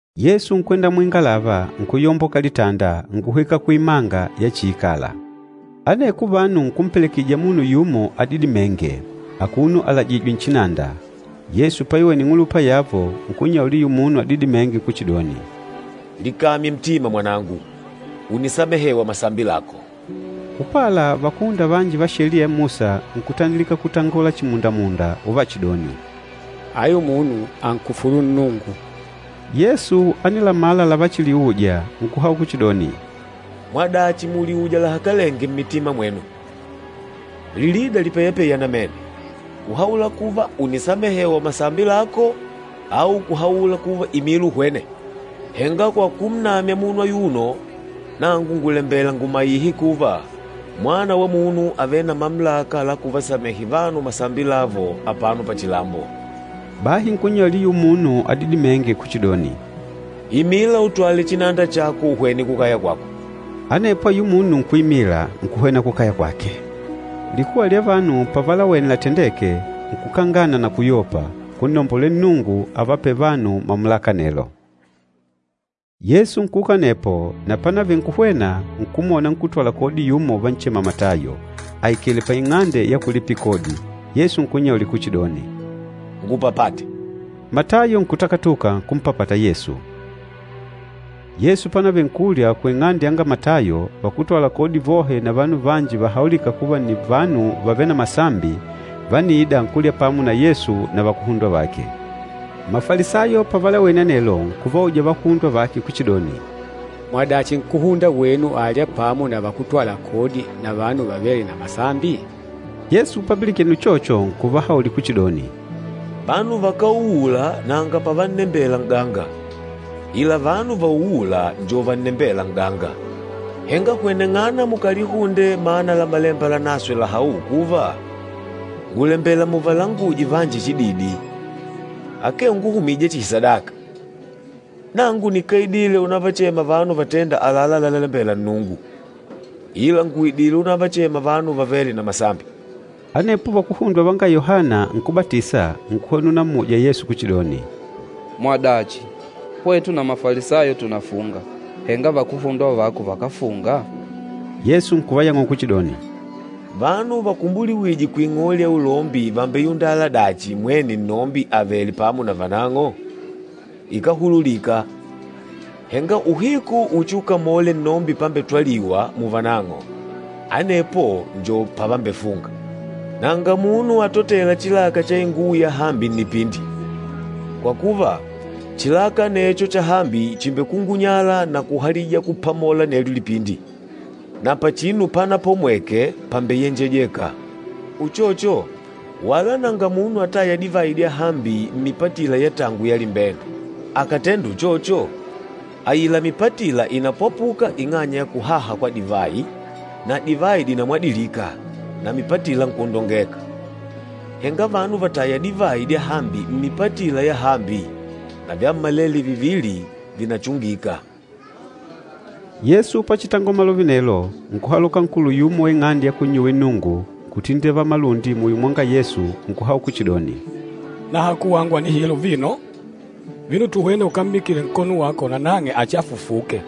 Yesu nkwenda muingalava, nkuyomboka litanda, nkuhwika kuimanga yachiikala. Aneko vanu nkumpelekejija munu yumo adidimênge, akuno alajìjwè nchinanda. Yesu paiwene ing'ulupa yavo, nkunnyaulila ayula munu adidimênge kuchidoni, “Likamye ntima mwanangu! Ùnisamehewa masambi lako.” Upala, vakúhunda vanji va Sheliya ya Musa nkutandilika kutangola chimundamunda uvachidoni, “Ayu munu ànkufulu Nnungu!” Yesu ánilamala lavachiliuja, nkuhaula kuchidoni, “Mwadachi mùliuja lahakalenge mmitima mwenu? Lilida lipeyapeya namene, kuhaula kuva, ‘Ùnisamehewa masambi lako,’ au kuhaula kuva, ‘Imila uhwene?’ Henga kwa kunnamya munu ayuno, nangu ngùlembela ngùmaihe kuva, Mwana wa Munu àvele na mamulaka la kuvasamehe vanu masambi lavo apano pachilambo.” Bahi nkunnyaulila ayula munu adidimênge kuchidoni, “Imila, utwale chinanda chako, uhwene kukaya kwako.” Anepo ayula munu nkuimila, nkuhwena kukaya kwake. Likuwa lya vanu pavalawene latendeke, nkukangana na kuyopa, nkunnombolela Nnungu avapêle vanu mamulaka anelo. Yesu nkuuka anepo, na pánavele nkuhwena, nkumwona nkútwala kodi yumo uvanchema Matayo, aikèlè paing'ande ya kulipila kodi. Yesu nkunnyaulila kuchidoni, “Ngupapate.” Matayo nkutakatuka, nkumpapata Yesu. Yesu pánavele nkulya kuing'ande yanga Matayo, vakútwala kodi vohe na vanu vanji vahaulîka kuva nni vanu vavêle na masambi, vániida nkulya pamo na Yesu na vakuhundwa vake. Mafalisayo pavalawene anelo, nkuvauja vakuhundwa vake kuchidoni, “Mwadachi nkúhunda wenu àlya pamo na vakútwala kodi na vanu vavêle na masambi?” Yesu papilikene uchocho, nkuvahaulila kuchidoni, “Vanu vakáuula nanga pavannembela n'ganga, ila vanu vauûla njo vannembêla n'ganga. Henga hweneng'ana mukalihunde mana la Malemba Lanaswe lahaûla kuva, ‘Ngùlembela muvalanguje vanji chididi, akee unguhumija chihi sadaka.’ Nangu nikáidile unavachema vanu vatênda àlalá lalalembela Nnungu, ila ngùidile unavachema vanu vavêle na masambi.” Anepo vakuhundwa vanga Yohana Nkúbatisa nkuhwena unamuja Yesu kuchidoni, “Mwadachi, hwetu na Mafalisayo tùnafunga, henga vakuhundwa vako vakáfunga?” Yesu nkuvayang'ula kuchidoni, “Vanu vakúmbuliwije kuing'ole ya ulombi vàmbeyundala dachi, mwene nnombi avèlè pamo na vanang'o? Ikáhululika! Henga uhiku uchiukamole nnombi pambetwaliwa muvanang'o, anepo njo pavambefunga. Nanga munu atotêla chilaka cha inguwo yahambi nnipindi. Kwa kuva, chilaka anecho chahambi chìmbekungunyala na kuhalija kupamola anelyo lipindi, na pachinu panapomweke pambeyenjejeka. Uchocho, wala nanga munu atâya divayi dyahambi mmipatila ya tangu ya limbende. Akàtenda uchocho, aila mipatila ìnapwapuka ing'anya ya kuhaha kwa divayi, na divayi dìnamwadilika, na mipatila nkwondongeka. Henga vanu vàtaya divayi dyahambi mmipatila yahambi, na vyammalele vivili vìnachungika.” Yesu pachitangola malove anelo, nkuhaloka nkulu yumo wa ing'ande ya kunnyuwila Nnungu, nkutindivala malundi muyo mwanga Yesu, nkuhaula kuchidoni, “Nahaku wangu ànihila uvino. Vino tuhwene ukammikile nkono wako, nanang'e achifufuke.”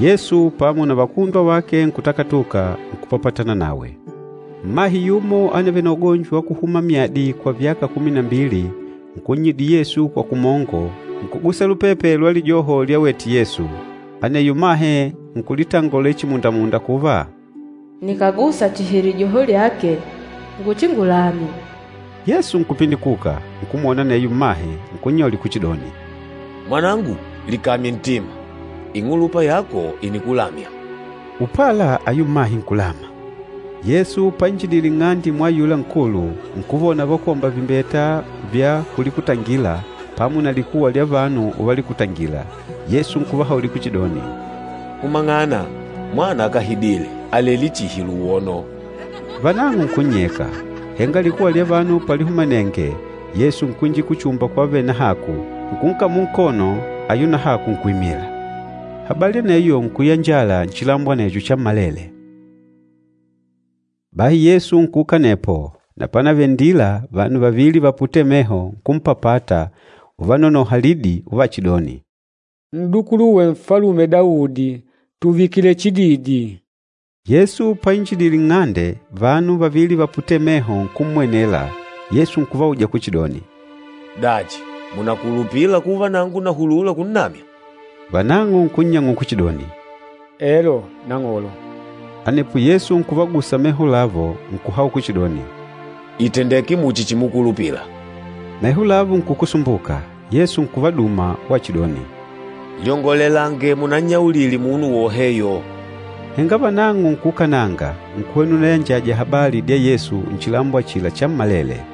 Yesu pamo na vakuhundwa vake nkutakatuka, nkupapatana nawe. Mmahe yumo ánavele na ugonjo wa kuhuma myadi kwa vyaka kumi na mbili, nkunnyidila Yesu kwa kumongo, nkugusa lupepe lwa lijoho lyawete Yesu. Aneyo mmahe nkulitangolela chimundamunda kuva, “Nikàgusa chihi lijoho lyake nguchingulame.” Yesu nkupindikuka, nkummwona aneyo mmahe, nkunnyaulila kuchidoni, “Mwanangu, likamye ntima! Ing'ulupa yako ìnikulamya.” Upala, ayula mmahe nkulama. Yesu painjidile nng'ande mwa ayula nkulu, nkuvona vakwómba vimbeta vya kulikutangila, pamo na likuwa lya vanu uvalikutangila. Yesu nkuvahaulila kuchidoni, “Humang'ana! Mwana akáhidile, àlelé chihi luwono.” Vanang'o nkunnyeka. Henga likuwa lya vanu palihumanenge, Yesu nkwinjila kuchumba kwavele nahaku, nkunkamula nkono, ayula nahaku nkuimila. Habali aneyo nkuyanjala nchilambo anecho chammalele. Bahi Yesu nkuuka anepo, na pánavele nndila, vanu vavili vaputêle meho nkumpapata uvanonoha lidi, uvachidoni, “N'dukuluwe Nfalume Daudi, tùvikile chididi!” Yesu painjidile nng'ande, vanu vavili vaputêle meho nkummwenela, Yesu nkuvauja kuchidoni, “Dachi, mùnakulupila kuva nangu nàhulula kunnamya?” Vanang'o nkunnyang'ula kuchidoni, “Elo, Nang'olo.” Anepo Yesu nkuvagusa meho lavo, nkuhaula kuchidoni, “Ìtendeke muchi chimukulupila.” Meho lavo nkukusumbuka. Yesu nkuvaduma wachidoni, “Lyongolelange munannyaulile munu woheyo.” Henga vanang'o nkuukananga, nkuhwena unayanjaja habali dya Yesu nchilambo achila chammalele.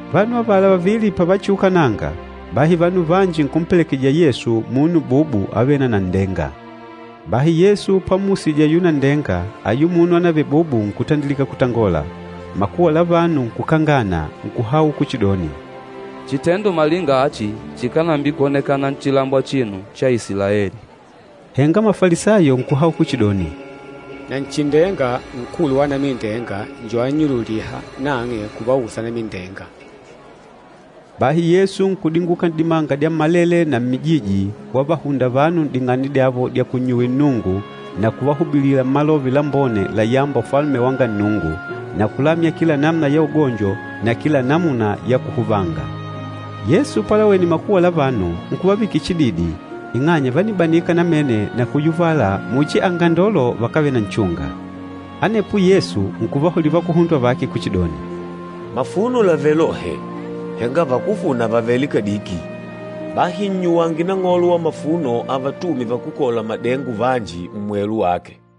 Vanu avala vavili pavachiukananga, bahi vanu vanji nkumpelekejija Yesu munu bubu avêle na nanndenga. Bahi Yesu pammusije ayula nanndenga, ayula munu ánavele bubu nkutandilika kutangola. Makuwa la vanu nkukangana, nkuhaula kuchidoni, “Chitendo malinga achi chikánambikwoneka nchilambo achino cha Isilaeli!” Henga Mafalisayo nkuhaula kuchidoni, “Nanchindenga, nkulu wa anamindenga njo annyululîha nang'e kuvausa anamindenga.” Bahi Yesu nkudinguka n'dimanga dyammalele na mmijiji, wavahunda vanu n'ding'ande dyavo dya kunnyuwila Nnungu na kuvahubilila Malove Lambone layâmba Ufalume wanga Nnungu, na kulamya kila namuna ya ugonjo na kila namuna ya kuhuvanga. Yesu palawene makuwa la vanu, nkuvavikila chididi ing'anya vánibanika namene na kuyuvala muchi angandolo vakávele na nchunga. Anepo Yesu nkuvahaulila vakuhundwa vake kuchidoni, “Mafuno làvele lohe, henga vakúfuna vàvele kadiki. Bahi nnyuwange Nang'olo wa mafuno avatume vakúkola madengo vanji, mmwelu wake.”